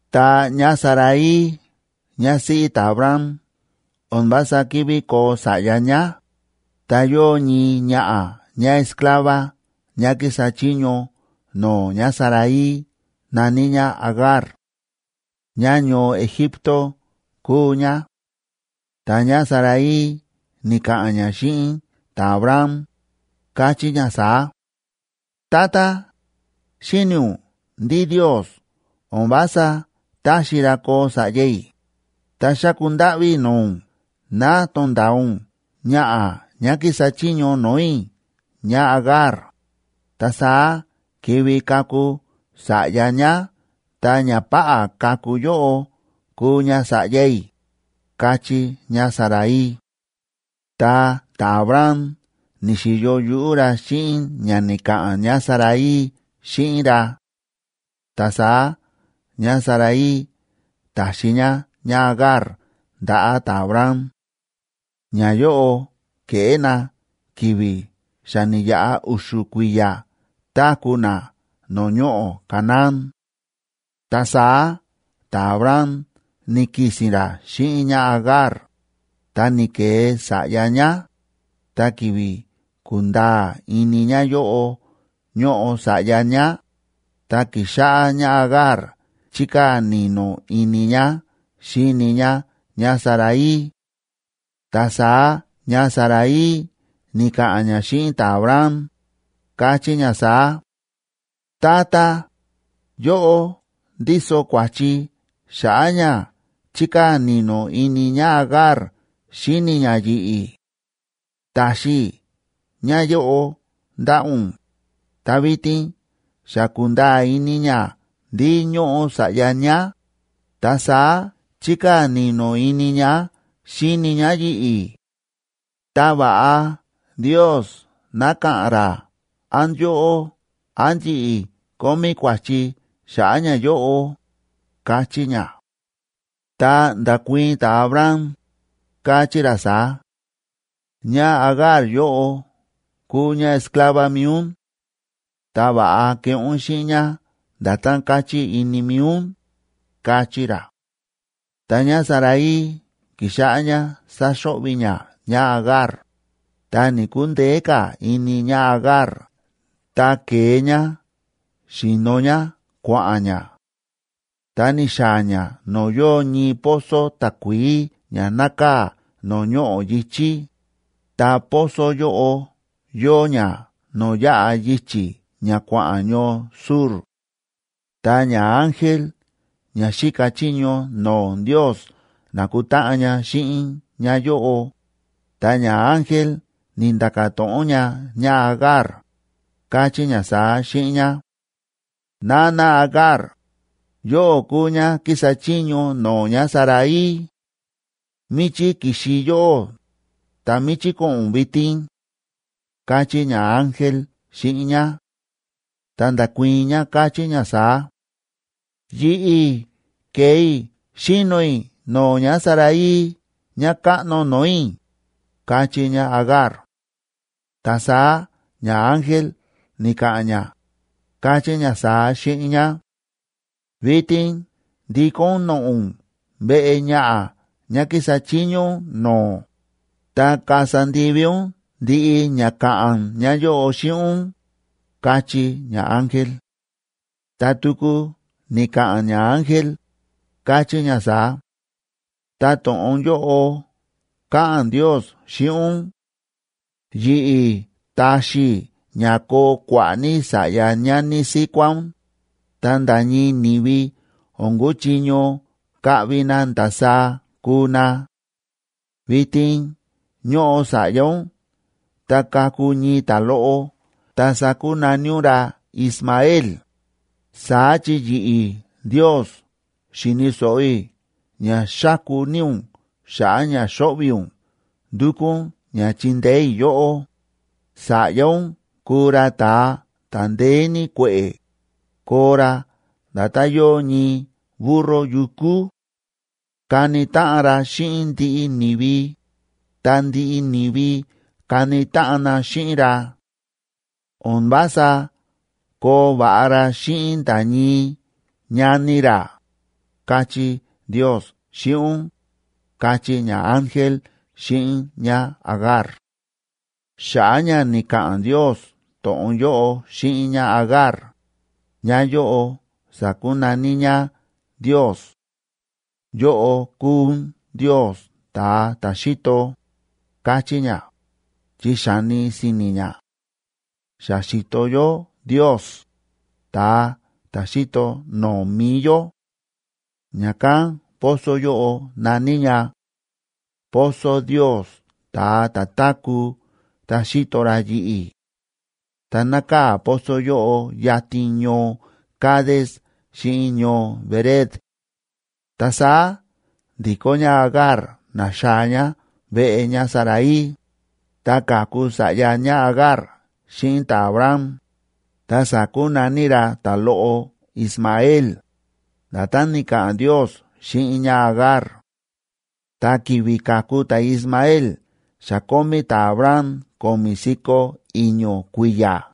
Ta ñáSarai ñásíꞌí ta̱Abram o̱n vása ki̱ví koo sa̱ꞌya ñá, ta yóo ñii ñaꞌa̱ ñáesclava ñá kísa chiño no̱o̱ ñáSarai na̱ní ñá Agar; ñáñoo Egipto kúu ñá. Ta ñáSarai ni̱ka̱ꞌa̱n ñá xíꞌin ta̱Abram, káchí ñá saá: ―Tata, xíni̱ ún ndí Ndiosa o̱n vása táxi ra koo sa̱ꞌya i̱, ta xáku ndáꞌví i̱ no̱o̱ ún ná to̱nda̱a ún ñaꞌa̱ ñá kísa chiño no̱o̱ i̱ ñáAgar, ta saá kivi kaku sa̱ꞌya ñá ta ñapáꞌá kaku yóꞌo kuu ña sa̱ꞌya i̱ ―káchí ñáSarai. Ta ta̱Abram ni̱xi̱yo yuꞌú ra xíꞌin ña ni̱ka̱ꞌa̱n ñáSarai xíꞌin ra. Ta saá ñáSarai ta̱xi ñá ñáAgar ndaꞌa̱ ta̱Abram. Ñayóꞌo ke̱ꞌé na ki̱vi̱ xa ni̱yaꞌa u̱xu̱ kui̱ya̱ táku̱ na no̱o̱ ñoꞌo̱ Canaán. Ta saá ta̱Abram ni̱ki̱si̱n ra xíꞌin ñáAgar, ta ni̱ke̱e sa̱ꞌya ñá, ta ki̱vi̱ ku̱nda̱a̱ ini ñáyóꞌo ñóꞌo sa̱ꞌya ñá, ta ki̱xáꞌá ñáAgar chíkaa̱ ni̱no̱ ini ñá xíni ñá ñáSarai. Ta saá ñáSarai ni̱ka̱ꞌa̱n ñá xíꞌin ta̱Abram, káchí ñá saá: ―Tata, yóꞌó ndíso kua̱chi xa̱ꞌa̱ ña chíkaa̱ ni̱no̱ ini ñáAgar xíni ñá yi̱ꞌi̱. Ta̱xi i̱ ñáyóꞌo ndaꞌa̱ ún, ta vitin xa ku̱nda̱a̱ ini ñá ndí ñóꞌo sa̱ꞌya ñá, ta saá chíkaa̱ ni̱no̱ ini ñá xíni ñá yi̱ꞌi̱. Ta va̱ꞌa Ndios ná ka̱ꞌa̱n ra án yóꞌó án yi̱ꞌi̱ kómí kua̱chi xa̱ꞌa̱ ñayóꞌo ―káchí ñá. Ta nda̱kuii̱n ta̱Abram, káchí ra saá: ―ÑáAgar yóꞌo kúu ñáesclava mi̱i ún. Ta va̱ꞌa keꞌé ún xíꞌin ñá nda̱tán káchí ini mi̱i ún ―káchí ra. Ta ñáSarai ki̱xáꞌá ñá sáxo̱ꞌvi̱ ñá ñáAgar, ta ni̱‑kundeé ka̱ ini ñáAgar ta ke̱e ñá xi̱no ñá kua̱ꞌa̱n ñá. Ta ni̱xaa̱ ñá no̱o̱ yóo ñii pozo takuií ña nákaa̱ no̱o̱ ñoꞌo̱ yi̱chí, ta pozo yóꞌo yóo ña no̱o̱ yáꞌa yichi̱ ña kua̱ꞌa̱n ñoo Shur. Ta ñaángel ña xíka chiño no̱o̱ Ndios na̱kutáꞌan ña xíꞌin ñáyóꞌo, ta ñaángel ni̱nda̱ka̱ to̱ꞌon ña ñáAgar, káchí ña saá xíꞌin ñá: ―Nana Agar, yóꞌó kúu ñá kísa chiño no̱o̱ ñáSarai. ¿Míchí ki̱xi yóꞌó, ta míchí ko̱ꞌo̱n ún vitin? ―káchí ñaángel xíꞌin ñá. Ta nda̱kuii̱n ñá, káchí ñá saá: ―Yi̱ꞌi̱ kée i̱ xíno i̱ no̱o̱ ñáSarai ñákáꞌno no̱o̱ i̱ ―káchí ñáAgar. Ta saá ñaángel ni̱ka̱ꞌa̱n ña, káchí ña saá xíꞌin ñá: ―Vitin ndikó ún noꞌo̱ ún veꞌe ñaꞌa̱ ñá kísa chiño ún no̱o̱, ta kasa ndivi ún ndiꞌi ña ka̱ꞌa̱n ñáyóꞌo xíꞌin ún ―káchí ñaángel. Ta tuku ni̱ka̱ꞌa̱n ñaángel, káchí ña saá: ―Ta to̱ꞌon yóꞌo káꞌa̱n Ndios xíꞌin ún: Yi̱ꞌi̱ taxi i̱ ña koo kua̱ꞌa̱ ní sa̱ꞌya ñani síkuá ún, ta nda̱ ñii ni̱vi o̱n kuchiño kaꞌvi na ndasaá kuu na. Vitin ñóꞌo sa̱ꞌya ún ta kaku ñii ta̱loꞌo, ta sakunaní ún ra Ismael,b saá chi yi̱ꞌi̱ Ndios xi̱ni̱ so̱ꞌo i̱ ña xáku ní ún xa̱ꞌa̱ ña xóꞌvi̱ ún ndúkú ún ña chindeé i̱ yóꞌó. Sa̱ꞌya ún kuu ra ta̱a ta̱ ndeé ní kue̱ꞌe̱, koo ra nda̱tán yóo ñii burro yukú; kani táꞌan ra xíꞌin ndiꞌi ni̱vi, ta ndiꞌi ni̱vi kani táꞌan na xíꞌin ra; o̱n vása koo va̱ꞌa ra xíꞌin nda̱ ñii ñani ra, káchí Ndios xíꞌin ún ―káchí ñaángel xíꞌin ñáAgar. Xa̱ꞌa̱ ña ni̱ka̱ꞌa̱n Ndios to̱ꞌon yóꞌo xíꞌin ñáAgar, ñáyóꞌo sa̱kunaní ñá Ndios: “Yóꞌó kúu ún Ndios ta̱a ta̱ xíto”, káchí ñá, chi xa̱ni si̱ni̱ ñá: “Xa xi̱to yó Ndios, ta̱a ta̱ xíto no̱o̱ mi̱i yó”. Ña̱kán pozo yóꞌo na̱ní ña Pozo Ndios, ta̱a ta̱ táku̱ ta xíto ra yi̱ꞌi̱. Ta nákaa̱ pozo yóꞌo yatin ñoo Cades xíꞌin ñoo Bered. Ta saá ndi̱kó ñáAgar na̱xaa̱ ñá veꞌe ñáSarai, ta ka̱ku sa̱ꞌya ñáAgar xíꞌin ta̱Abram, ta sa̱kunaní ra ta̱loꞌo Ismael, nda̱tán ni̱ka̱ꞌa̱n Ndios xíꞌin ñáAgar. Ta ki̱vi̱ ka̱ku ta̱Ismael xa kómí ta̱Abram ko̱mi̱ si̱ko̱ i̱ño̱ kui̱ya̱.